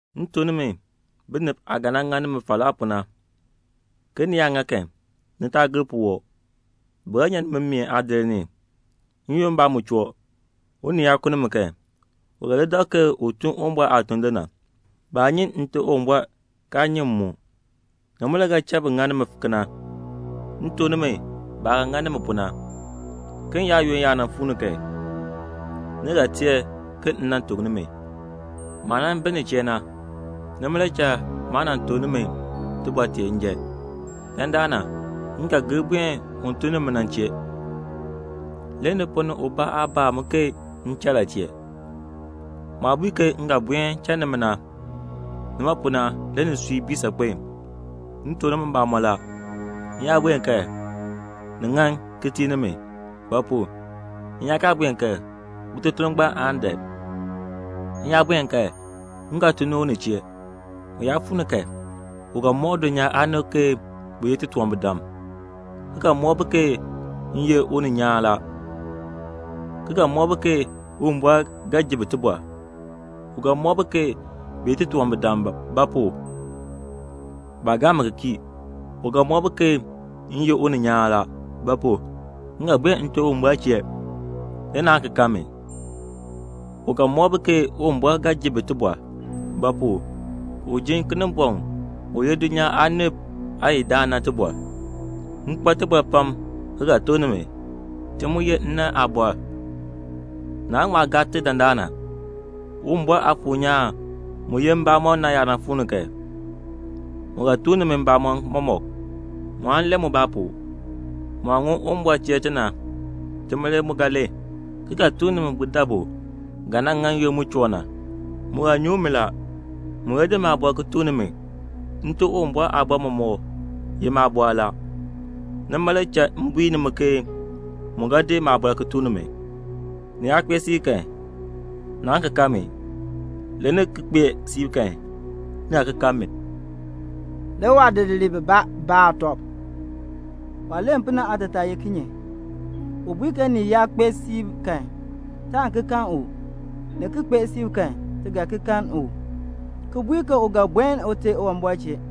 "M tuk nimi binib aah ga nan ŋa nimi falaa pu na, ke ni yaa ŋa kan, ni taa gir puwɔb. Bi ga nyan nimi mmeen aadir ni; n-yoonn mbaa mu choo, unii yaa ku nimi kan, u ga li dak ke u tun Uwumbɔr aatuln le na. Baa nyi Nte Uwumbɔr kaa nyi m mu. Nima le ga cha bi ŋa nimi kena. M tuk nimi baah ga ŋa nimi pu na, ke n-yaayoonn yaa nan fuu ni kan, ni ga teer ke m nan tuk nimi." "Maah nan bi ni chee na, nima le cha maa nan tuk nimi tibɔr tee njan. Dandana, m ga ki gir buen un tun ni mi na chee, le ni ponn ni ubaa aa baa mi ke m cha la chee. Maah bui ke m ga buen cha nimi na, nima pu na le nisui bii saakpen. M tuk nimi mbamɔn la, m yaa buen kan, ni ŋan ki tii nimi; ba pu? m yaa kaa buen kan, Uteter ngbaan aan dan. M yaa buen kan, m ga tun ni u ni chee. U yaa fuu ni kan, u ga mɔk dulnyaa aanib ke bi ye titunwambirdam, ki ga mɔk bi ke m ye uninyaan la, ki ga mɔk bi ke Uwumbɔr ga ji bi tibɔr. U ga mɔk bi ke bi ye titunwambirdam; ba pu? baa gaa mi ki kii. U ga mɔk bi ke m ye uninyaan la; ba pu? m ga buen Nte Uwumbɔr chee, le naan ki kan mi. U ga mɔk bi ke Uwumbɔr ga ji bi tibɔr; ba pu? u jin Kinimbɔŋ u ye dulnyaa aanib aayidaan na tibɔr. "M kpa tibɔr pam ki ga tuk nimi; ti mu ye nnann aabɔr, naan ŋma gaa ti dandana. Uwumbɔr Aafuur nyaan mu ye mbamɔn na yaa fuu ni kan, mu ga tuk nimi mbamɔn mɔmɔk; mu aan len mubaa pu; mu aah ŋun Uwumbɔr chee ti na, tima le mu ga len, ki ga tuk nimi budabu ga nan ŋa n-yoonn mu choo na. Mu ga nyuŋ mi la; mu ga di maabɔr ki tuk nimi. Nte Uwumbɔr aabɔr mɔmɔk ye maabɔr la. Nima le cha m bui nimi ke mu ga di maabɔr ki tuk nimi." "Ni yaa kpee siib kan, naan ki kan mi. Le ni ki kpee siib kan, ni ga ki kan mi." Le waadidiliib bibaa baa tɔb, "Waah len pu na aatataa ye kinye? U bui ke ni yaa kpee siib kan, taan ki kan u, ni ki kpee siib kan, ti ga ki kan u, ki bui ke u ga buen Ute Uwumbɔr chee.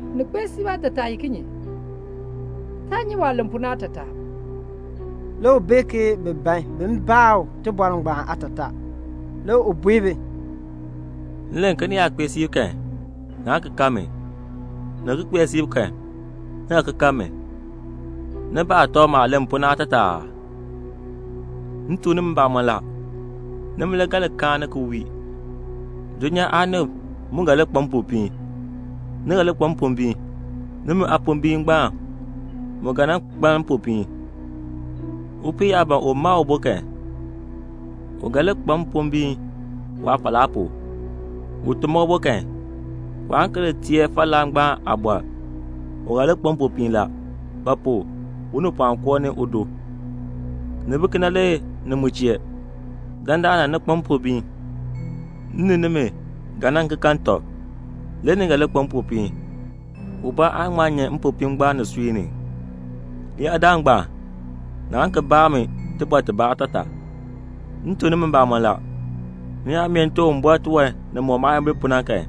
'Ni kpee siib' aatataa ye kinye? Taa nyi waah len pu na aatataa." Le u bee ke bi ban bin baa u tibɔr ngbaan aatataa. Le u bui bi, "M len ke ni yaa kpee siib kan, naan ki kan mi, ni ki kpee siib kan, ni ga ki kan mi. Ni baa tɔb maah len pu na aatataa la aa? M tuk nimi mbamɔn la, nimi le ga li kaani ki wii; dulnyaa aanib mu ga li kpa mpopiin. Ni ga li kpa mpombiin; nimi aapombiin ngbaan mu ga nan kpaln mpopiin. Upii yaa ban u ma ubo kan, u ga li kpa mpombiin waafalaa pu. U ti ma ubo kan, waan ki li teer falaa ngbaan aabɔr, u ga li kpa mpopiin la; ba pu? unipɔɔn koo ni udo. Ni bi kena le ni mu chee. Dandana ni kpa mpombiin. M ni nimi ga nan ki kan tɔb, le ni ga li kpa mpopiin. Ubaa aan ŋma nyan mpopiin ngbaan nisui ni. "Leyaadaal ngbaan, naan ki baa mi tibɔr tibaa aatataa. M tuk nimi mbamɔn la, ni yaa mee Nte Uwumbɔr tiwan nimɔk maayimbil pu na kan,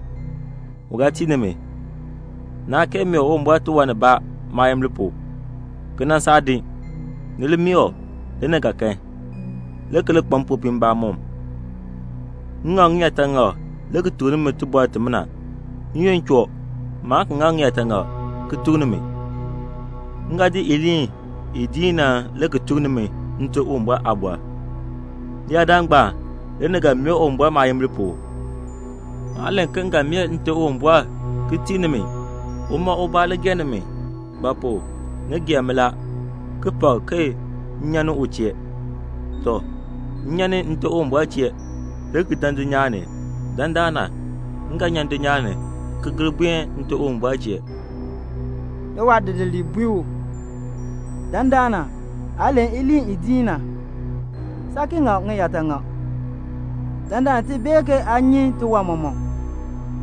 u ga tii nimi. Naa kee mee Uwumbɔr tiwan nibaa maayimbil pu, ki nan saa din. Ni li mee u, le ni ga kan, le ki li kpa mpopiin mbamɔm." "M ŋak ŋiyaataŋak le ki tuk nimi tibɔr timina. N-yoonn choo, maan ki ŋak ŋiyaataŋak ki tuk nimi. M ga di iliin i diin na le ki tuk nimi Nte Uwumbɔr aabɔr. Leyaadaal ngbaan le ni ga mee Uwumbɔr maayimbil pu. Maa len ke m ga mee Nte Uwumbɔr ki tii nimi; uma ubaa le gee nimi; ba pu? ni gee mi la, ki pak ke m nyan ni u chee. Tɔ, m nyan ni Nte Uwumbɔr chee, le ki dan dulnyaa ni. Dandana, m ga nyan dulnyaa ni, ki gir buen Nte Uwumbɔr chee." Le waadidiliib bui u, "Dandana, aa len iliin i diin na. Saa ki ŋak ŋiyaataŋak. Dandana ti bee ke aa nyi tiwan mɔmɔk.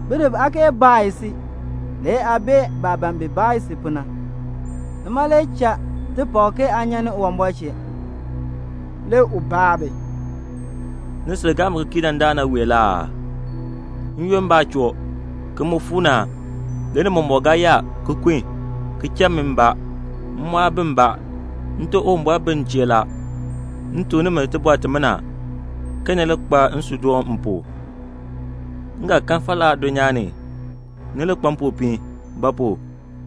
Binib aa kee baa si, le aa bee baah ban bin baa si pu na. Nima le cha ti pak ke aa nyan ni Uwumbɔr chee." Le u baa bi, "Ni sil gaa mi ki kii dandana wee la aa? N-yoonn mbaa choo, ki mu fuu ni a, le ni mɔmɔk ga yaa, ki kun, ki cha mi mbaa; m mu aa bi mbaa. Nte Uwumbɔr bi m chee la. M tuk nimi tibɔr timina, ke ni li kpa nsuudoon m pu. Ni ga kan falaa dulnyaa ni. Ni li kpa mpopiin; ba pu?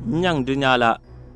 m nyaŋ dulnyaa la."